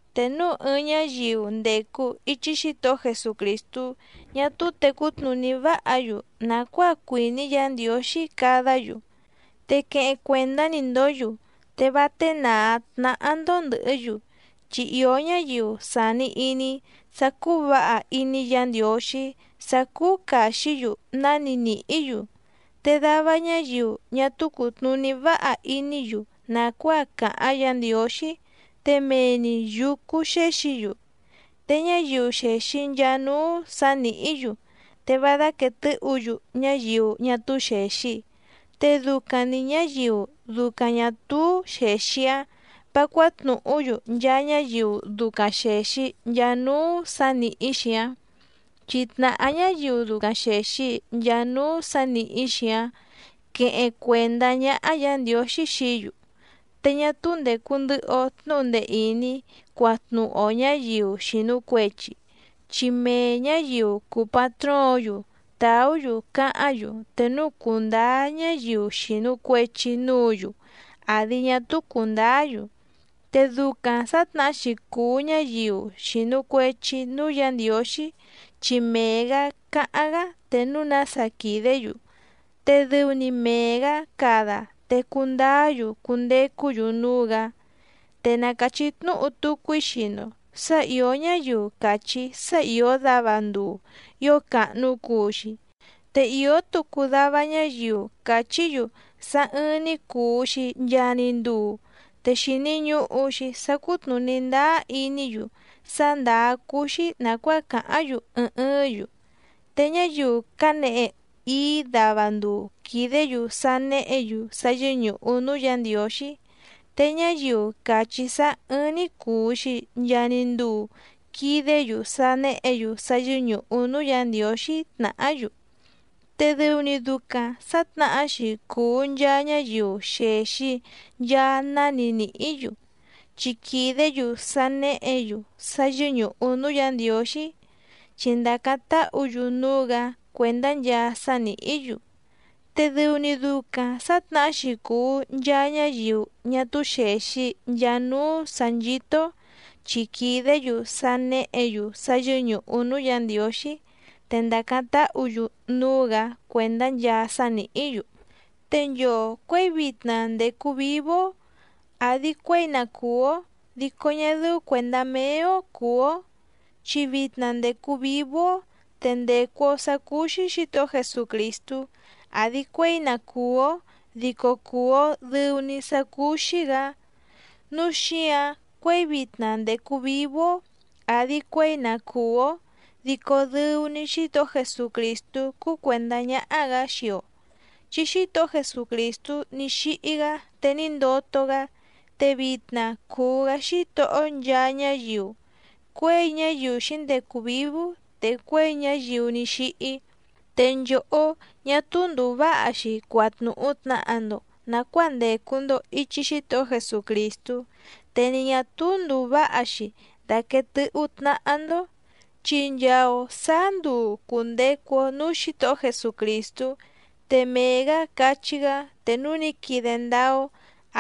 Te núu ɨɨⁿ ñáyiu ndècu ichi Xítohó Jesucrìstú ñá túú tècú tnùní váha‑yu nàcuáa cuìní Yǎ Ndiǒxí cadá‑yu, te queheⁿ cuèndá‑ni‑ndǒ‑yu te vá ténàá tnáhá‑ndó ndɨ̀hɨ́‑yu. Chi ìó ñáyiu sàni iní sá cúú vǎha iní Yǎ Ndiǒxí sá cúú càxí‑yu náni nìhí‑yu, te dava ñáyiu ñá túú cùtnuní váha iní‑yu nàcuáa càháⁿ Yǎ Ndiǒxí te mee‑ni yǔcú xéxǐ‑yu. Te ñáyiu xèxi nchaa núú sǎ nìhí‑yu te vá dáquèe tɨ́hǔ‑yu ñáyiu ñá túú xèxi, te ducaⁿ‑ni ñǎyiu ducaⁿ ñà túú xèxi‑áⁿ vǎ cuátnùhú‑yu nchaa ñáyiu ducaⁿ xèxi nchaa núú sǎ nìhí‑xi‑áⁿ, chi tnàhá ñáyiu ducaⁿ xèxi nchaa núú sǎ nìhí‑xi‑áⁿ quéhéⁿ cuèndá ñáhá Yǎ Ndiǒxí xií‑yu. Te ñá túú ndècu ndɨhɨ‑o tnúhu ndee ìní cuatnúhu‑o ñǎyiu xìnu cuechi, chi mee ñǎyiu cùu patróǒⁿ‑yu tàú‑yu cáháⁿ‑yu te núu cùndáá ñáyiu xìnu cuechi núǔ‑yu àdi ñá túú cùndáá‑yu. Te ducaⁿ sǎtnahá‑xi cùu ñáyiu xìnu cuechi núú Yǎ Ndiǒxí, chi mee‑gǎ cáháⁿ‑gá te núu nása quìdé‑yu, te dɨu‑ni mee‑gǎ cada te cundáá‑yu cundecú‑yu núú‑gǎ. Te na càchí tnúhu tucu‑í xii‑ndo sǎ ìó ñáyiu càchí sá ìó dava nduu ío càhnu cuu‑xi, te ìó tucu dava ñáyiu càchí‑yu sá ɨ̀ɨⁿ‑ni cuu‑xi nchaa‑ni nduu, te xìni ñuhu‑xi sá cùtnuní ndáá iní‑yu sá ndàá cúú‑xí nàcuáa càháⁿ‑yu ɨɨⁿ ɨɨ́ⁿ‑yu. Te ñáyiu cánehe íí dava nduu quìdé‑yu sá néhě‑yu sá yɨ́ñùhu núú Yǎ Ndiǒxí, te ñáyiu càchí sá ɨ́ɨ́ⁿ‑ní cùu‑xi nchaa‑ni nduu quìdé‑yu sá néhě‑yu sá yɨ́ñùhu núú Yǎ Ndiǒxí tnàhá‑yu. Te dɨu‑ni ducaⁿ sǎtnahá‑xi cùu nchaa ñáyiu xèxi nchaa náni nìhí‑yu, chi quìdé‑yu sá néhě‑yu sá yɨ́ñùhu núú Yǎ Ndiǒxí, chi ndàcáⁿ táhǔ‑yu núú‑gǎ cuèndá nchaa sá nìhí‑yu. Te dɨu‑ni ducaⁿ sǎtnahá‑xi cùu nchaa ñáyiu ñá túú xèxi nchaa núú sǎ nchító‑ó chi quìdé‑yu sá néhě‑yu sá yɨ́ñùhu núú Yǎ Ndiǒxí, te ndàcáⁿ táhǔ‑yu núú‑gǎ cuèndá nchaa sá nìhí‑yu. Te nchoo cuěi vitna ndècu vívú‑ó àdi cuéi na cùú‑ó dico ñá dɨ́ú cuèndá méé‑ó cùú‑ó. Chi vitna ndècu vívú‑ó te ndècu‑o sá cúú‑xí Xǐtohó Jesucrìstú àdi cuéi na cùú‑ó dico cuú‑ó dɨ̀u‑ni sá cúú‑xí‑gǎ, núu xíǎⁿ cuěi vitna ndècu vívú‑ó àdi cuéi na cùú‑ó dico dɨu‑ni Xítohó Jesucrìstú cúú cuèndá ñáhá‑gǎ xii‑o. Chi Xítohó Jesucrìstú ní xíhí‑gá te ní ndoto‑gá, te vitna cùu‑gá Xítohó nchaa ñáyiu, cuěi ñáyiu xǐndecu vǐvú te cuěi ñáyiu ní xíhí. Te nchòhó, ñá túú ndùu váha‑xi cuatnuhu tnàha‑ndo nacuáa ndècu‑ndo ichi Xítohó Jesucrìstú, te ni ñà túú ndùu váha‑xi daquèe tɨ́hú tnáhá‑ndó, chi nchaa‑o sǎá nduu cùndecu‑o núú Xǐtohó Jesucrìstú, te mee‑gǎ cachí‑gá te núu ní quide ndáá‑ó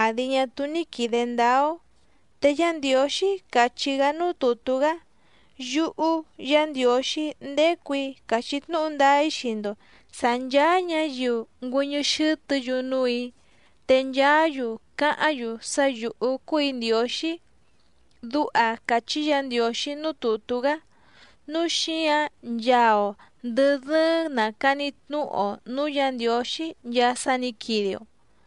àdi ñá túú ní quìde ndáá‑ó. Te Yá Ndiǒxí càchí‑gá núú tùtú‑gá: Yúhú Yǎ Ndiǒxí ndécù‑í càchí tnúhu ndáá‑í xii‑ndo sǎ nchàa ñáyiu ngüɨ́ñɨ́ xɨ́tɨ̌‑yu núù‑í, te nchaá‑yu cáháⁿ‑yu sá yǔhú cúù‑í Ndiǒxí. Duha càchí Yǎ Ndiǒxí núú tùtú‑gá. Núu xíǎⁿ nchaa‑o ndɨ̀ dɨ́ɨ́ⁿ nàcani tnúhu‑o nǔú Yǎ Ndiǒxí nchaa sá nǐ quide‑o.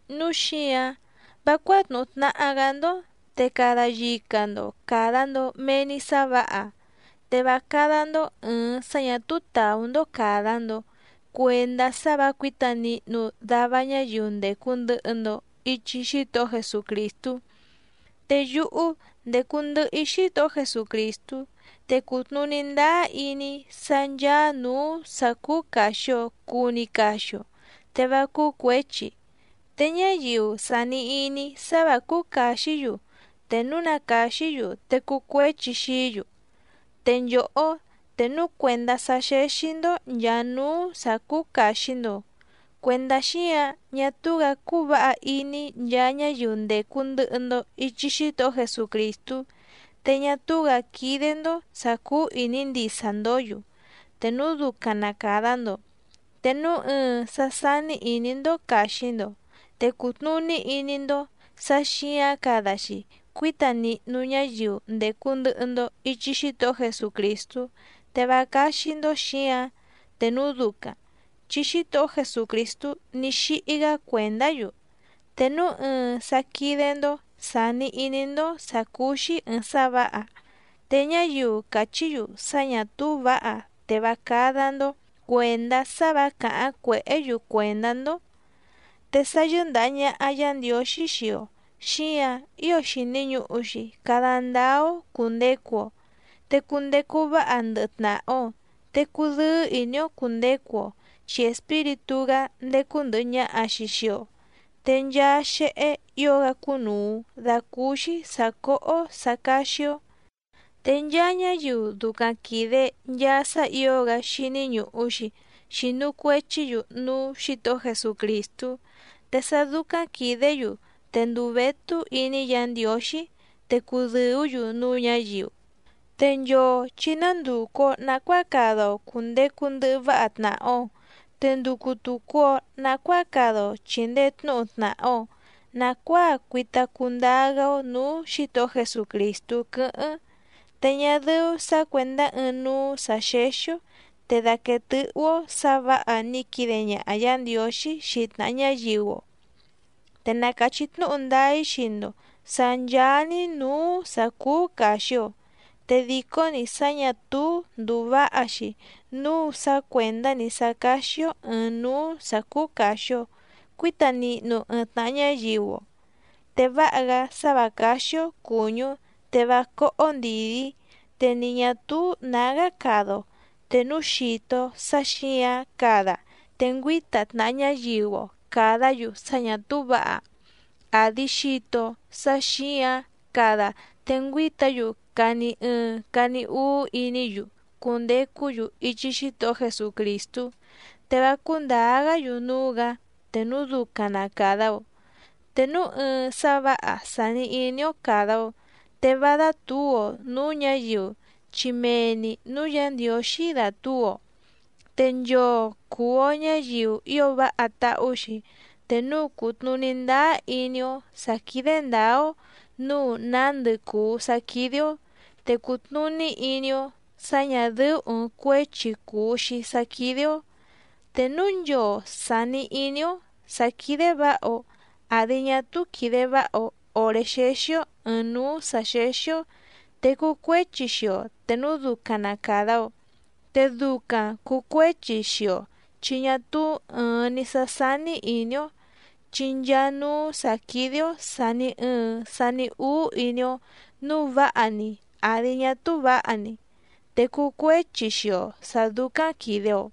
Núu xíǎⁿ vá cuátnùhu tnaha‑gá‑ndó, te cada yica‑ndo càda‑ndo mee‑ni sá vǎha, te vá cádá‑ndó ɨ̀ɨⁿ sá ñà túú tàú‑ndó càda‑ndo cuendá sá vǎ cuǐta nihnu dava ñáyiu ndècu ndɨhɨ‑ndo ichi Xítohó Jesucrìstú. Te yúhú ndécú ndɨ̀hɨ‑í Xítohó Jesucrìstú te cùtnuní ndáá iní‑í sá ncháá nǔú sǎ cúú càxi‑o cuu‑ni caxi‑o te vá cúú cuěchi. Te ñáyiu sàni iní sá vǎ cúú càxí‑yu te núu na càxí‑yu te cuu cuéchi xií‑yu. Te nchòhó, te núu cuèndá sá xéxí‑ndó nchàa núú sǎ cúú càxi‑ndo, cuèndá xíǎⁿ ñá túú‑gǎ cúú vǎha iní nchaa ñáyiu ndècu ndɨhɨ‑ndo ichi Xítohó Jesucrìstú, te ñá túú‑gǎ quídé‑ndó sǎ cúú ìní ndisa‑ndǒ‑yu te núu ducaⁿ na càda‑ndo, te núu ɨɨⁿ sá sání ìní‑ndó càxi‑ndo te cùtnuní iní‑ndó sǎ xǐǎⁿ cada‑xi cuíta nihnu ñáyiu ndècu ndɨhɨ‑ndo ichi Xítohó Jesucrìstú te vá cáxí‑ndó xǐǎⁿ te núu ducaⁿ, chi Xítohó Jesucrìstú ní xíhí‑gá cuèndá‑yu. Te núu ɨɨⁿ sá quídé‑ndó sàni iní‑ndó sǎ cúú‑xí ɨ̀ɨⁿ sá vǎha, te ñáyiu càchí‑yu sá ñà túú vǎha te vá cádá‑ndó cuèndá sá vǎ càháⁿ cuèhé‑yu cuèndá‑ndó. Te sá yɨ́ndàha ñaha Yá Ndiǒxí xii‑o xíǎⁿ ío xìni ñuhu‑xi cada ndáá‑ó cùndecu‑o, te cundecu váha ndɨhɨ tnàha‑o, te cudɨ́ɨ́ ìní‑ó cùndecu‑o chi Espíritú‑gá ndécú ndɨ̀hɨ ñaha‑xi xii‑o, te nchaa xéhé ǐo‑gá cúnùu dacúúxí sǎ cóhó sǎ cáxí‑ó. Te nchaa ñáyiu ducaⁿ quìde nchaa sá ǐo‑gá xíní ñùhu‑xi, xinu cuechí‑yu núú Xǐtohó Jesucrìstú, te sá dúcáⁿ quìdé‑yu te ndùu vétú iní Yǎ Ndiǒxí, te cùdɨú‑yu núú ñǎyiu. Te nchoo chǐ ná ndùcu‑o nacuáa cada‑o cùndecu ndɨhɨ váha tnàha‑o, te nducu tùcu‑o nacuáa cada‑o chìndee tnúhu tnàha‑o nacuáa cuita cundáá‑gá‑ó nǔú Xǐtohó Jesucrìstú quɨ́hɨ́ⁿ. Te ñá dɨ́ú sǎ cuèndá ɨɨⁿ núú sǎ xéxí‑ó, te dàquee tɨ́hú‑ó sǎ vǎha ní quide ñaha Yǎ Ndiǒxí xii tnàha ñáyiu‑o. Te na càchí tnúhu ndáá‑í xii‑ndo sǎ ncháá‑ní nǔú sǎ cúú càxi‑o, te dìcó‑ni sá ñà túú ndùu váha‑xi núu sá cuèndá‑ni sá cáxí‑ó ɨ̀ɨⁿ núú sǎ cúú càxi‑o cuíta nihnu ɨɨⁿ tnàha ñáyiu‑o. Te váha‑gá sá vǎ cáxí‑ó cùñú te vá cóhó ndìdí, te ni ñà túú nǎgá cada‑o te núu xìto‑o sá xǐǎⁿ cada te ngüíta tnàha ñáyiu‑o càdá‑yu sá ñà túú vǎha, àdi xito‑o sá xǐǎⁿ cada te ngüíta‑yu cani ɨɨⁿ cani úú iní‑yu cundecú‑yu ichi Xítohó Jesucrìstú, te vá cúndǎá‑gá‑yu núú‑gǎ te núu ducaⁿ na càda‑o. Te núu ɨɨⁿ sá vǎha sàni iní‑ó càda‑o, te vá dátǔu‑o nǔú ñǎyiu chi mee‑ni nǔú Yǎ Ndiǒxí dàtúu‑o. Te nchoo cùu‑o ñáyiu ío váha táhú‑xi te núu cùtnuní ndáá iní‑ó sǎ quídé ndǎá‑ó nǔu nándɨ cùu sá quídé‑ó, te cùtnuní iní‑ó sǎ ñà dɨ́ú ɨ̀ɨⁿ cuéchi cùu‑xi sá quídé‑ó. Te núu nchoo sàni iní‑ó sǎ quídé vǎha‑o àdi ñá túú quìde váha‑o òré xéxí‑ó ɨ̀ɨⁿ núú sǎ xéxí‑ó, te cuu cuéchi xii‑o te núu ducaⁿ na càda‑o. Te ducaⁿ cùu cuéchi xii‑o chi ñá túú ɨ̀ɨⁿ‑ni sá sání ìní‑ó, chi nchaa núú sǎ quídé‑ó sàni ɨɨⁿ sani úú iní‑ó nǔu váha‑ni àdi ñá túú vǎha‑ni, te cuu cuéchi xii‑o sǎ dúcáⁿ quìde‑o.